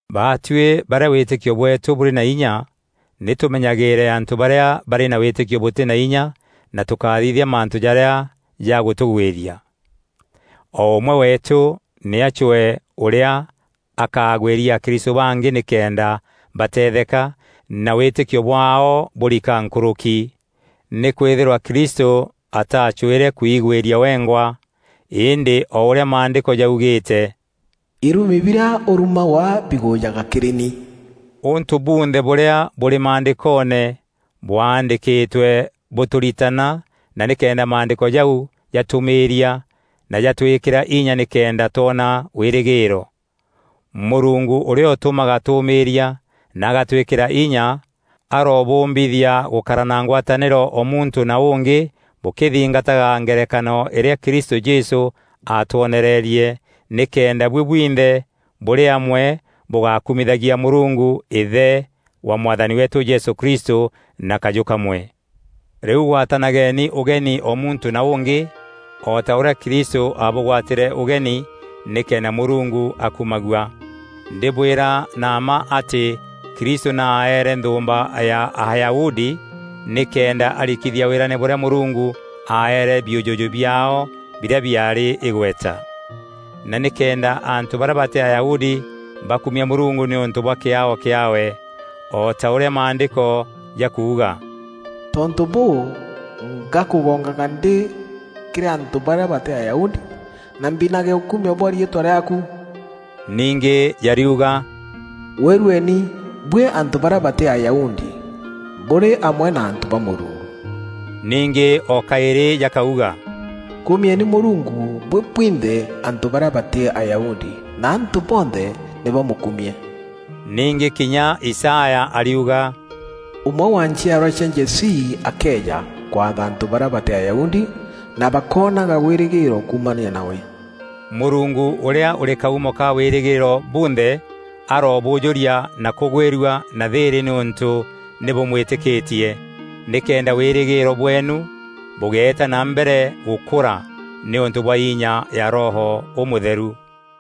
Baatuî barîa wîtîkio bweetû bûrî na inya nî tûmenyagîîre antû barîa barî na wîtîkio bûtî na inya na tûkáthithia mantû jarîa jagûtûgwîria. O ûmwe weetû nî acwee ûrîa akagwîria akristû bangî nîkenda batetheka, na wîtîkio bwaao bûrika nkûrûki. Nîkwîthîrwa Kristû ataacwîre kwigwîria wengwa. Îndî o ûrîa Maandîko jaugîîte, “Irumi birîa ûrumagwa bigûjaga kîrî ni.” Ûntû bunthe bûrîa bûrî Maandîkoone bwaandîkîtwe bûtûritana na nîkenda Maandîko jau jatûûmîîria na jatwîkîra inya nîkenda twona wîrîgîîro. Mûrungu ûrîa ûtûmaga tûûmîîria na agatwîkîra inya arobûûmbithia gûkara na ngwatanîro o muntû na ûngî bûkîthîngataga ngerekano îrîa Kristû Jesû aatwonererie, nîkenda buî bwinthe bûrî amwe bûgakumithagia Mûrungu, Îthe wa Mwathani weetû Jesû Kristû na kajû kamwe. Rîu gwatanageni ûgeni o muntû na ûngî, o ta ûrîa Kristû aabûgwatîre ûgeni, nîkenda Mûrungu akumagua. Ndîbwîra na mma atî Kristû nî aaere nthûûmba ya Ayahudi nîkenda arikithia wîrane bûrîa Mûrungu aaere biûjûjû biaao birîa biaarî îgweta, na nîkenda antû barîa batî Ayahudi bakumia Mûrungu nîûntû bwa kîaao kîaawe. O ta ûrîa Maandîko jakuuga, “Tontû bûû, ngakûgongaga ndî kîrî antû barîa batî Ayahudi; na mbinage ûkumio bwa riîtwa rîaaku.” Ningî jariuga, “Gwîrueni buî antû barîa batî Ayahudi bûrî amwe na antû ba Mûrungu.” Ningî o kaîrî jakauga, “Kumieni Mûrungu buî bwinthe antû barîa batî Ayahudi, na antû bonthe nî bamûkumie.” Ningî kinya Isaya ariuga, “Ûmwe wa nchiarwa cia Jesii akeeja, kwatha antû barîa batî Ayahudi, na bakoonaga wîrîgîîro kuumania nawe.” Mûrungu ûrîa ûrî kaumo ka wîrîgîîro bunthe arobûûjûria na kûgwîrua na thîîrî nîûntû nî bûmwîtîkîtie, nîkenda wîrîgîîro bweenu bûgeeta na mbere gûkura nîûntû bwa inya ya Roho Ûmûtheru.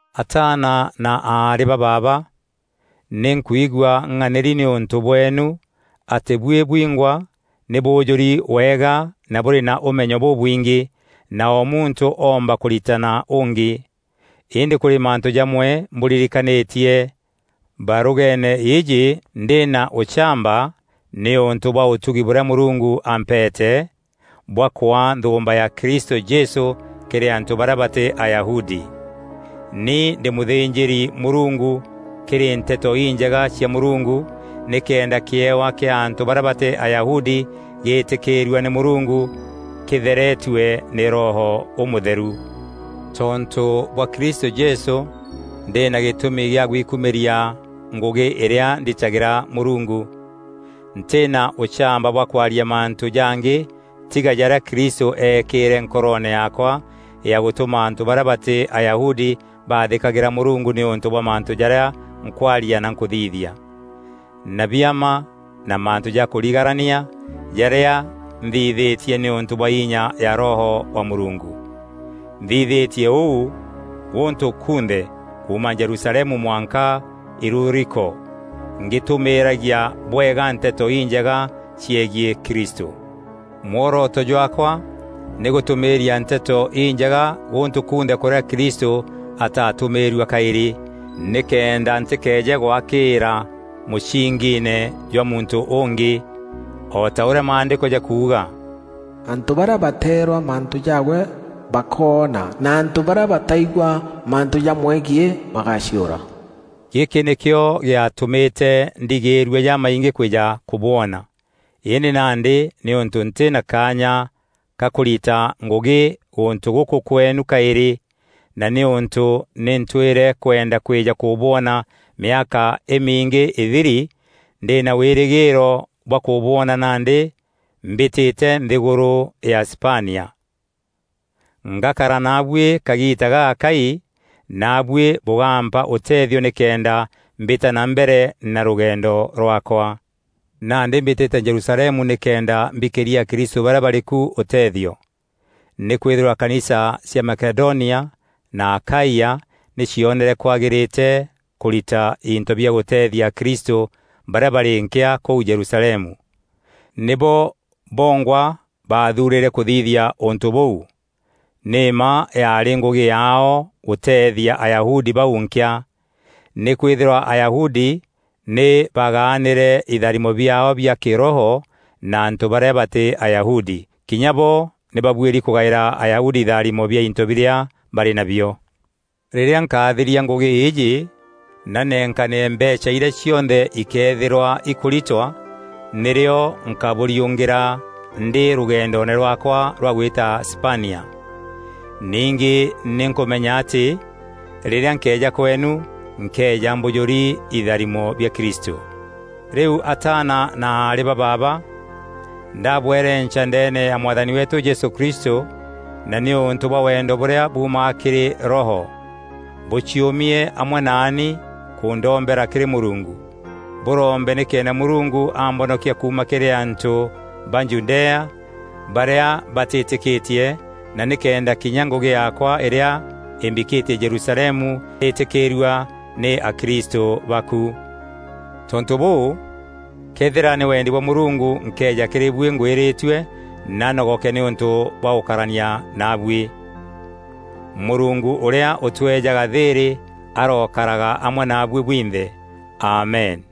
Ataana na aarî ba baaba, nî nkwigua ng'anîri nîûntû bweenu, atî buî bwîngwa nî bûûjûri wega na bûrî na ûmenyo bûbwingî, na o muntû oomba kûritana ûngî. Îndî kûrî mantû jamwe mbûririkanîtie barûgeene îîjî ndî na ûchamba, nîûntû bwa ûtugi bûrîa Mûrungu ampeete, bwa kwaa nthûûmba ya Kristû Jesû kîrî antû barîa batî Ayahudi. Ni ndî mûthînjîri-Mûrungu kîrî Nteto Injega cia Mûrungu, nîkenda kîewa kîa antû barîa batî Ayahudi gîîtîkîîrua nî Mûrungu, kîtheretue nî Roho Ûmûtheru. Tontû bwa Kristû Jesû, ndî na gîtûmi gîa gwikumîria ngûgî îrîa nditagîra Mûrungu. Ntî na ûchamba bwa kwaria mantû jangî tiga jarîa Kristû eekîîre nkoroone yaakwa ya gûtûma antû barîa batî Ayahudi baathîkagîra Mûrungu nîûntû bwa mantû jarîa nkwaria na nkûthithia, na biama na mantû ja kûrigarania, jarîa nthithîtie nîûntû bwa inya ya Roho wa Mûrungu. Nthithîtie ûu gûntû kunthe, kuuma Jerusalemu mwanka Iluriko, ngîtûmîîragia bwega Nteto Injega ciegiî Kristû. Mworoto jwaakwa nî gûtûmîîria Nteto Injega gûntû kunthe kûrîa Kristû ataatûmîîrua kaîrî, nîkenda ntîkeeje gwakîîra mûsingiine jwa muntû ûngî. O ta ûrîa Maandîko jakuuga: “Antû barîa bateerwa mantû jaawe bakoona, na antû barîa bataigua mantû jamwegiî bagaciûra.” Gîkî nîkîo gîatûmîte ndigîîrua jamaingî kwîja kûbwona. Îndî nandî nîûntû ntî na kaanya ka kûrita ngûgî gûntû gûkû kweenu kaîrî, na nîûntû nî ntwîre kwenda kwîja kûbwona mîaka îmingî îthiri, ndî na wîrîgîîro bwa kûbwona nandî mbîtîte nthîgûrû ya Spania. Ngakara naabuî kagiita gagakai, naabuî bûgaampa ûteethio nîkenda mbîta na mbere na rûgendo rwaakwa. Nandî mbîtîte Jerusalemu nîkenda mbikîria akristû barîa barî ku ûtethio. Nîkwîthîrwa kanisa cia Makedonia na Akaia nî cionere kwagîrîte kûrîta into bia gûteethia akristû barîa barî nkîa kûu Jerusalemu. Nîbo bongwa baathuurîre kûthithia ûntû bûu. Nî mma yaarî ngûgî yaao gûteethia Ayahudi bau nkîa. Nîkwîthîrwa Ayahudi nî bagaanîre itharimo biaao bia kîroho na antû barîa batî Ayahudi, kinya bo nî babuîri kûgaîra Ayahudi itharimo bia into birîa barî nabio. Rîrîa nkathiria ngûgî îîjî na nenkanîre mbeecha irîa cionthe ikeethîrwa ikûritwa, nîrîo nkabûriûngîra ndî rûgendoone rwaakwa rwa gwîta Spania. Ningî nî nkûmenya atî rîrîa nkeeja kweenu, nkeeja mbûjûri itharimo bia Kristû. Rîu ataana na aarî ba baaba, ndaabwerenca ndeene ya Mwathani weetû Jesû Kristû na nîûntû bwa wendo bûrîa buumaga kîrî Roho, bûciûmie amwe naani kûndombera kîrî Mûrungu. Bûrombe nîkenda Mûrungu ambonokia kuuma kîrî antû ba Judea barîa batîîtîkîtie na nîkenda kinya ngûgî yaakwa îrîa îmbikîtie Jerusalemu îtîkîîrua nî akristû ba ku. Tontû bûu, këethîra nî wendi bwa Mûrungu nkeeja kîrî buî ngwîrîtue na nogoke nîûntû bwa gûkarania naabuî. Mûrungu ûrîa ûtweejaga thîîrî arokaraga amwe naabuî bwinthe. Amen.